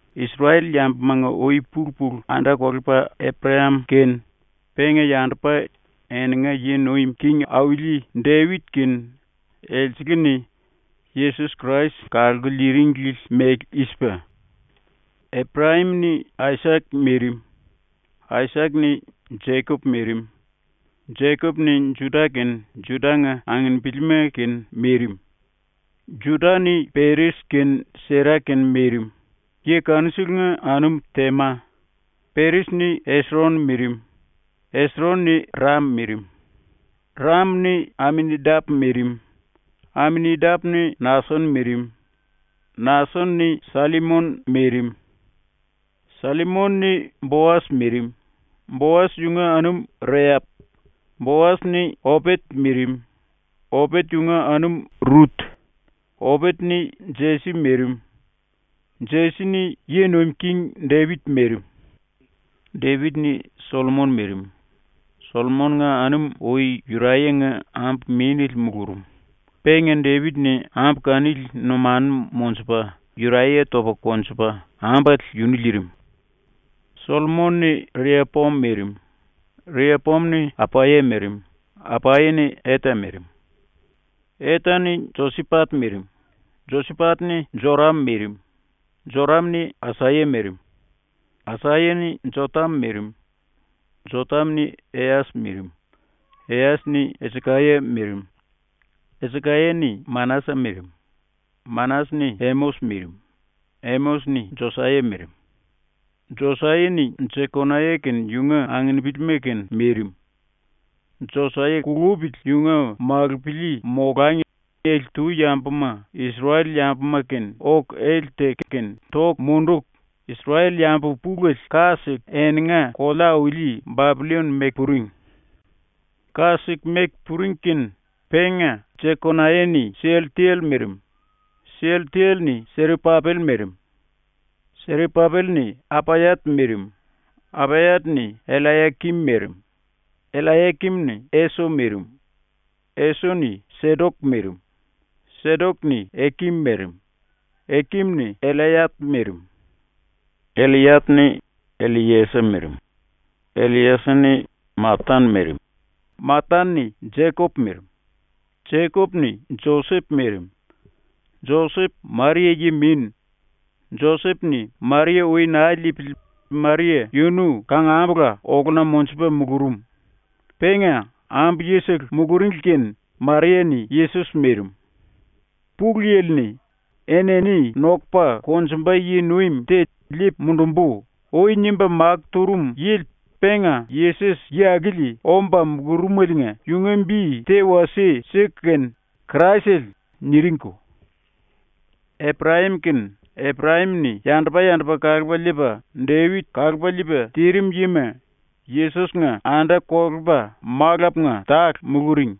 ⸤Isrel-yambumanga ui-pulu-pulu anda-kolepa⸥ Eprayam kene penga yandupa ⸤eninga yi nuim king auli⸥ Depit kene elsele-ni Yesos Krais kalku liiringli mele i-sipa: Eprayam-ni Aisak mirim; Aisak-ni Jekop mirim; Jekop-ni Juda kene Juda-nga anginipilima kene mirim; Juda-ni Péres kene Sera kene mirim, yi kanuselenga anum Tema; Péres-ni Esron mirim; Esron-ni Ram mirim; Ram-ni Aminadap mirim; Aminadap-ni Nason mirim; Nason-ni Sallimon mirim; Sallimon-ni Boas mirim, Boas yunga anum Reap; Boas-ni Opet mirim, Opet yunga anum Rut; Opet-ni Jesi mirim; Jesi-ni Yi Nuim King Depit mirim. Depit-ni Sollomon mirim. Sollomon-nga anum ui Yuraya-nga ambu-mínele mulurum. Penga Depit-ni ambu kanili numanu monjupa Yuraya topa konjupa ambale yunu liirim. Sollomon-ni Riapoam mirim; Riapoam-ni Apaya mirim; Apaya-ni Eta mirim; Eta-ni Josipat mirim; Josipat-ni Joram mirim; Joram-ni Asaya mirim; Asaya-ni Jotam mirim; Jotam-ni Eyas mirim; Eyas-ni Esikaya mirim; Esikaya-ni Manasa mirim; Manasa-ni Emos mirim; Emos-ni Josaya mirim; Josaya-ni Jekonaya kene yunga anginipilima kene mirim. Josaya kulupili yunga malupili molangi ele-tu yambuma Isrel-yambuma-kene oku ele teku kene toku munduku, Isrel-yambu pulele ka siku eninga kolea-auli Bapillon meku puring. Ka siku meku puring kene penga Jekonaya-ni Sialtel mirim; Sialtel-ni Serapapel mirim; Serapapel-ni Apayat mirim; Apayat-ni Ellayakim mirim; Ellayakim-ni Eso mirim; Eso-ni Sedok mirim; Sedok-ni Ekim mirim; Ekim-ni Ellayat mirim; Ellayat-ni Elliesa mirim; Elliesa-ni Matan mirim; Matan-ni Jekop mirim; Jekop-ni Josep mirim. Josep Maria yi-min. Josep-ni Maria ui naa liipili Maria yunu kangambula oluna monjupa mulurum. Penga ambu-yisele muluringli kene Maria-ni Yesos mirim. ⸤Pulu Yili-ni “Enini nokupa konjumba yi-nuim te liipu mundumbu.” ui nimba makó turum yili penga Yesos yi akili omba mulurumeliinga⸥ yunga bi te wasie siku kene ‘Kraisele’ niringko. Eprayam kene Eprayam-ni yandupa-yandupa kalupa liipa Depit kalupa liipa tirim yima ⸤Yesos-nga⸥ anda-kolepa malapunga tale muluring.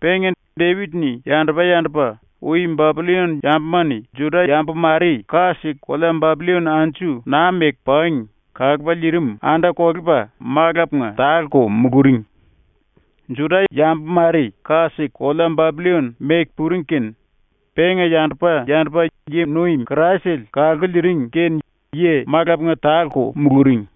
Penga Depit-ni yandupa-yandupa ui Bapillon yambuma-ni Juda-yambu mare ka siku kolea Bapillon anju naa meku pangi kalupa liirim anda-kolepa malapunga tale-ko muluring. Juda-yambu mare ka siku kolea Bapillon meku puring kene penga yandupa-yandupa yi-nuim Kraisele kalku liiring kene yi malapunga tale-ko muluring.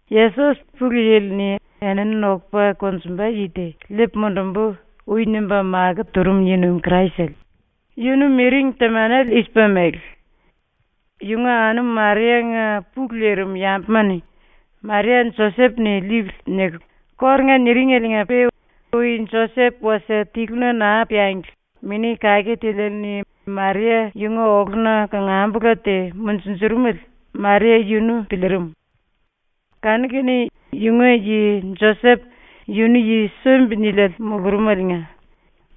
Yesos, Pulu Yili-ni “Enini nokupa konjumba yi te liipu mundumbu.” ui nimba makó turum yi-nuim Kraisele, yunu miring temanele i-sipa mele: Yunga anum Maria-nga pulu lirim yambuma-ni “Maria Josep-ni liipili.” niku kórunga niringeliinga-pe ui Josep wasie tiluna naa piangli Mini Kake Tiliele-ni Maria yunga oluna kangambula te munjunjurumele Maria yunu piliirim. Kanu-kene yunga yi Josep yunu yi sumbi-niliele mulurumeliinga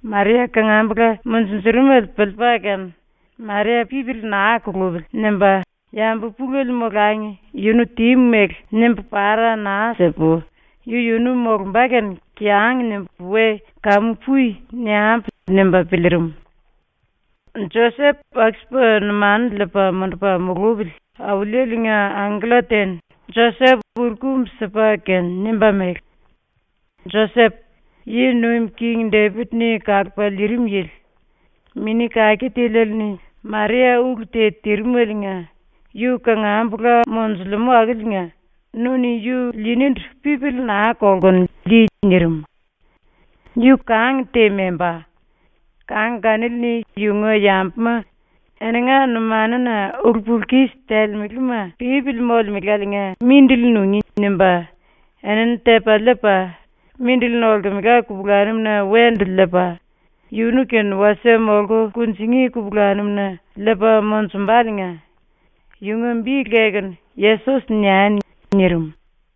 Maria kangambula munjurumele piliipa kene ‘Maria pipili naa kulupili.’ nimba ‘Yambu pulele molangi yunu tímu mele nimbu para naa sipu yu-yunu molumba kene kiyang nimbu we “Kamu pui.” niambu.’ nimba piliirim. Josep aku-sipa numanu liipa mundupa mulupili Auliele-nga angkella te-ni Josep uru-kumbu sipa kene nimba mele: “Josep, yi nuim king Depit-ni kalupa liirim yili, Mini Kake Tiliele-ni Maria ulu te tirimeliinga yu kangambula monjulemú akiliinga nu-ni yu liinindu pipili naa kolkunu, lii.” ⸤nirim.⸥ “Yu kang te membá. Kang kanili-ni yunga yambuma ‘Eninga numanuna ulu-pulu-kis telemelema pípili molemeláliinga mindili nungí.’ nimba enini tepa liipa, mindili nolkemela kupulanum-na wendu liipa, yunu-kene wasie molku kunjingí kupulanum-na liipa monjumbaliinga yunga bi lekunu “Yesos” niani.” nirim.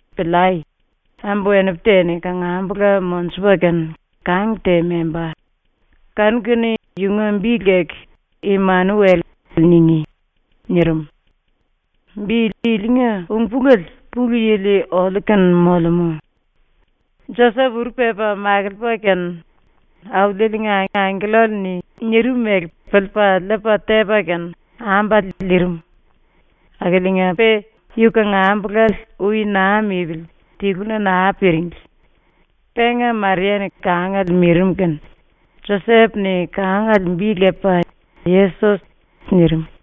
“Piliai. Ambu-wenipu te-ni kangambula monjupa kene kang te membá. Kanu-kene yunga bi leku “Imanuel” ningí.” nirim. Bi ilinga ung-pulele ‘Pulu Yili oliu-kene molemú’. Josep uru pepa makiliipa kene Auliele-nga angkellale-ni nirim mele piliipa liipa tepa kene ambale liirim. Akiliinga-pe yu kangambulale ui naa mipili tiluna naa piringli. Penga Maria-ni kangale mirim kene Josep-ni kangale bi lepa “Yesos” nirim.